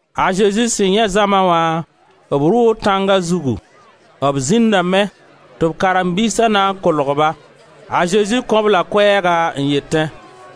A Zezi sẽn yãe zãma wã, b rʋʋ tãnga zugu. B zĩndame tɩ b karen-biisa na n kolg-ba. A Zezi kõ-b la koɛɛga n yetẽ: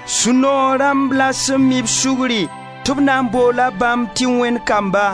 Sũ-noog rãmb la sẽn mi-b sugri, tɩ b na n boola bãmb tɩ Wẽnd kamba.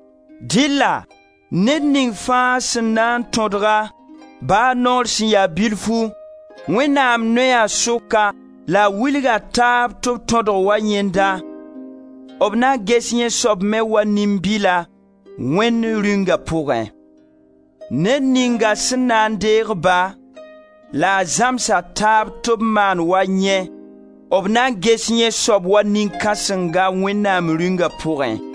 Dɩlla ned ning fãa sẽn na n tõdg-a, ba noor sẽn ya bilfu, Wẽnnaam noya sʋka la a wilg a taab tɩ b tõdg wa yẽnda, b na ges yẽ soab me wa nin-bila, Wẽnd Rĩunga pʋgẽ. Ned ninga sẽn na n deeg-ba la a zãms a taab tɩ b maan wa yẽ, b na ges yẽ soab wa nin-kãsenga Wẽnnaam Rĩunga pʋgẽ.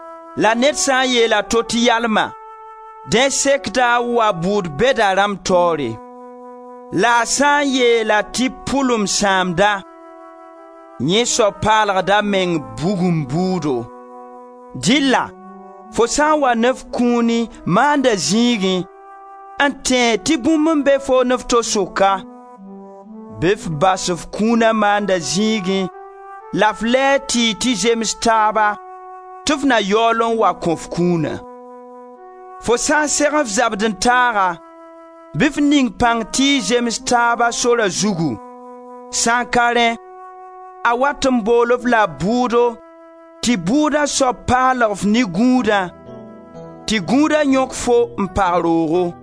La ned sã n yeel a to tɩ yalma, dẽ sekda a wa bʋʋd-bɛda rãmb taoore. La a sã n yeel-a tɩ pʋlum-sãamda, yẽ soab paalgda a meng bugum bʋʋdo. Dɩlla fo sã n wa ne f kũuni maanda zĩigẽ, n tẽeg tɩ bũmb n be foo ne f to sʋka, bɩ f bas f kũuna maanda zĩigẽ la f lɛɛg tɩ y tɩ zems taaba tɩ f na yaool n wa kõ f kũuna. Fo sã n seg f zabd-n-taaga, bɩ f ning pãng tɩ y zems taaba sora zugu, sã n ka rẽ a wat n bool-f la bʋʋdo tɩ bʋʋda soab paalg-f ne gũudã, tɩ gũuda yõk fo n pag roogo.